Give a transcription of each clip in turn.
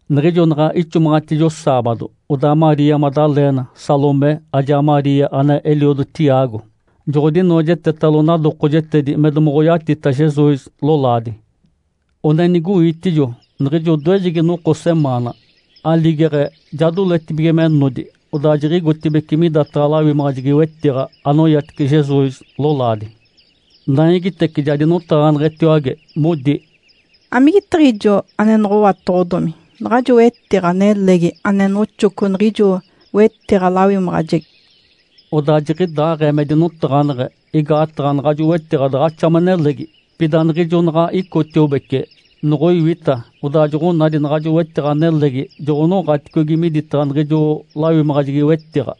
Niɡ̶ijo naɡ̶a ixomaɡ̶atijo saabado, odaa Maria Madalena, Salomé ajaa Maria ane eliodo Tiago joɡ̶odinoojetetalo nadokojetedi me domoɡ̶oyatita Jesus lolaadi. One nigoitijo niɡ̶ijo odoejegi noko semaana, aligeɡ̶e ja doletibige me nodi, odaa jiɡ̶igotibeci midataɡ̶a lawimaɡ̶ajegi-wetiɡ̶a anoyatice Jesus lolaadi. Naigitece ja dinotaɡ̶aneɡ̶etiwage, modi, “Amigetiɡ̶ijo ane noɡ̶owatoɡ̶odomi naɡ̶ajo wetiɡ̶a nelegi ane noxoco niɡ̶ijo wetiɡ̶a-lawimaɡ̶ajegi?” Odaa jiɡ̶idaaɡ̶ee me dinotaɡ̶aneɡ̶e igaataɡ̶a naɡ̶ajo wetiɡ̶a daɡ̶axa me nelegi. Pida niɡ̶ijo naɡ̶a icotiobece, noɡ̶oiwita, odaa joɡ̶onadi naɡ̶ajo wetiɡ̶a nelegi joɡ̶onoɡ̶aticogi midataɡ̶a niɡ̶ijo lawimaɡ̶ajegi-wetiɡ̶a.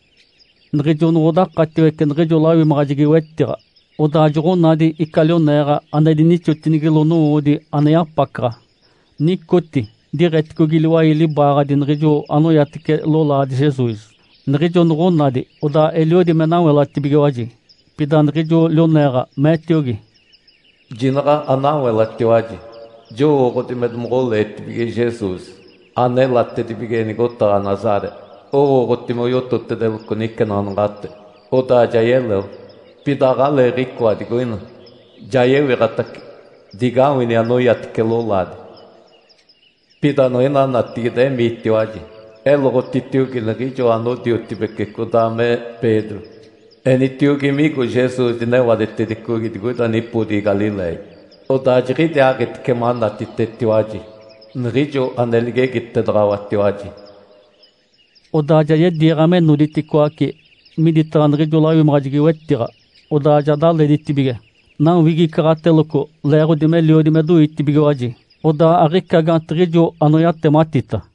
Niɡ̶ijo noɡ̶odakatiwece niɡ̶ijo lawimaɡ̶ajegi-wetiɡ̶a, odaa joɡ̶onadi ica lioneeɡ̶a ane dinixotinigilo nowoodi ane yapacaɡ̶a. Nicoti diɡ̶eticogi liwai libaaɡ̶adi niɡ̶ijo anoyatice lolaadi Jesus. Niɡ̶ijo noɡ̶onadi, odaa eliodi me nawelatibigiwaji. Pida niɡ̶ijo lioneeɡ̶a meetiogi, “Jinaɡ̶a anawelatiwaji! Jowooɡ̶odi me domoɡ̶oleetibige Jesus anelatibige nigotaɡ̶a Nazaré. Owooɡ̶oti moyototedeloco nicenaɡ̶anaɡ̶ate, odaa ja yeleo. Pida aɡ̶aleeɡ̶icoa digoina, ja yewiɡ̶atace. Digawini anoyatice lolaadi. Pida niɡ̶ina natigide emiitiwaji, eloɡ̶otitiogi niɡ̶ijo anodiotibece codaa me Pedro. Enitiogi migo Jesus dinewadetedicogi digoida nipodigi Galiléia. Odaa jiɡ̶idiaaɡ̶itice manatitetiwaji, niɡ̶ijo ane ligegitedaɡ̶awatiwaji.” Odaa ja yediiɡ̶a me noditicoaci midataɡ̶a niɡ̶ijo lawimaɡ̶ajegi-wetiɡ̶a, odaa ja daleditibige, nawigicaɡ̶ateloco, leeɡ̶odi meliodi me doitibigiwaji. Odaa aɡ̶ica gaantiɡ̶ijo anoyatematita.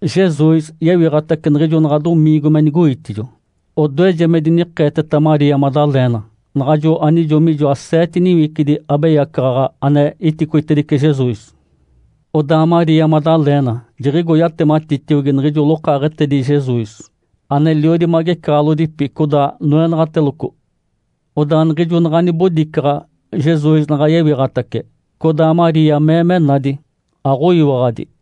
Jesus yewiɡ̶atace niɡ̶ijo naɡ̶a domiingo me nigoitijo. Odoeje me dinikeeteta Maria Madalena, naɡ̶ajo anijo mijoa seete niwicidi abeyacaɡ̶aɡ̶a ane iticoitedice Jesus. Odaa Maria Madalena jiɡ̶igo, yatematitiogi niɡ̶ijo lokaaɡ̶etedi Jesus aneliodi magecaɡ̶alodipi codaa noenaɡ̶ateloco. Odaa niɡ̶ijo naɡ̶a nibodicaɡ̶a Jesus naɡ̶a yewiɡ̶atace, codaa Maria mee me nadi, aɡ̶oyiwaɡ̶adi.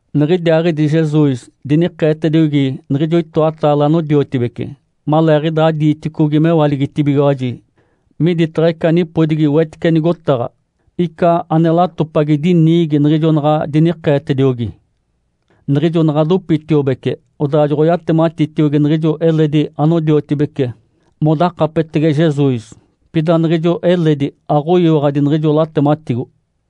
Niɡ̶idiaaɡ̶idi Jesus dinikeetediogi niɡ̶ijo itoataale anodiotibece maleeɡ̶idaa diiticogi mewaligitibigiwaji miditaɡ̶a ica nipodigi wetice nigotaɡ̶a. Ica ane latopagi diniigi niɡ̶ijo naɡ̶a dinikeetediogi. Niɡ̶ijo naɡ̶a dopitiobece, odaa joɡ̶oyatematitiogi niɡ̶ijo eledi anodiotibece modakapetege Jesus. Pida niɡ̶ijo eledi aɡ̶oyiwaɡ̶adi niɡ̶ijo latematigo.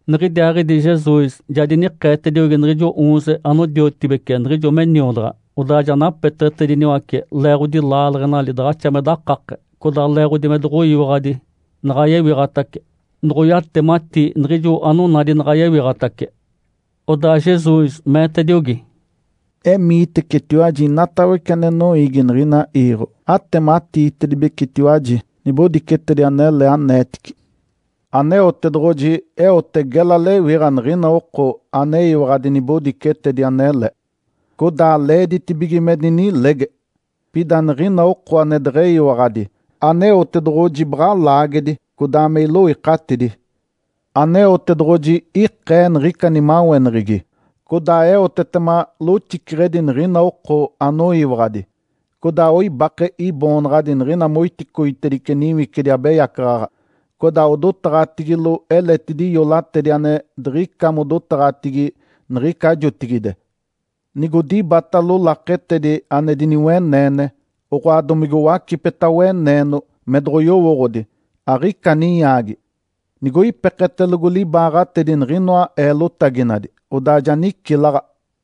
Niɡ̶idiaaɡ̶idi Jesus ja dinikeetediogi niɡ̶ijo oonze anodiotibece niɡ̶ijo me niodaɡ̶a. Odaa ja napeteɡ̶etediniwace leeɡ̶odi laaleɡ̶enali daɡ̶axa me dakake, codaa leeɡ̶odi me doɡ̶oyiwaɡ̶adi naɡ̶a yewiɡ̶atace noɡ̶oyatemati niɡ̶ijo anonadi naɡ̶a yewiɡ̶atace. Odaa Jesus meetediogi, “Emiitecetiwaji inatawece ane noiigi niɡ̶ina iiɡ̶o, atematiitedibecetiwaji nibodicetedi anele aneetici. Aneotedoɡ̶oji eote gela lewiɡ̶a niɡ̶ina oko aneyiwaɡ̶adi nibodicetedi anele, codaa leeditibige me dinilege. Pida niɡ̶ina oko ane deɡ̶eyiwaɡ̶adi, Aneotedoɡ̶oji baɡ̶a laagedi codaa me iloikatidi. Aneotedoɡ̶oji ikee niɡ̶ica nimaweneɡ̶egi, codaa eotetema loxiceɡ̶edi niɡ̶ina oko anoyiwaɡ̶adi. Codaa oibake Iboonaɡ̶adi niɡ̶ina moiticoitedice niwicidi abeyacaɡ̶aɡ̶a, codaa odotaɡ̶atigilo eletidi iolatedi ane diɡ̶ica modotaɡ̶atigi niɡ̶ica jotigide. Nigodibatalo laketedi ane diniweneene, oɡ̶oa domige owacipeta weneeno me doɡ̶oyowooɡ̶odi, aɡ̶ica ninyaagi. Nigoipeketelogo libaaɡ̶atedi niɡ̶inoa eelotaginadi, odaa ja nicilaɡ̶a.”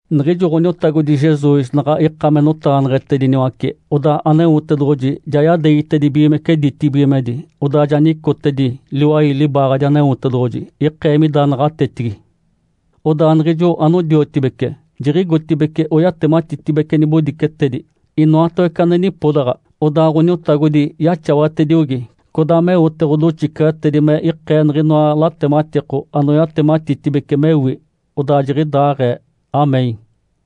Niɡ̶ijo Ǥoniotagodi Jesus naɡ̶a ika me notaɡ̶aneɡ̶etediniwace, odaa Aneotedoɡ̶oji ja yadeegitedibigimece ditibigimedi, odaa ja nicotedi liwai libaaɡ̶adi Aneotedoɡ̶oji ikee mida naɡ̶atetigi. Odaa niɡ̶ijo anodiotibece jiɡ̶igotibeci oyatematitedibece nibodicetedi inoatawece ane nipodaɡ̶a. Odaa Ǥoniotagodi yaxawatediogi, codaa meote ɡ̶odoxiceɡ̶etedi me ikee niɡ̶inoa latematiko anoyatematitibece mewi. Odaa jiɡ̶idaaɡ̶ee. (Amém.)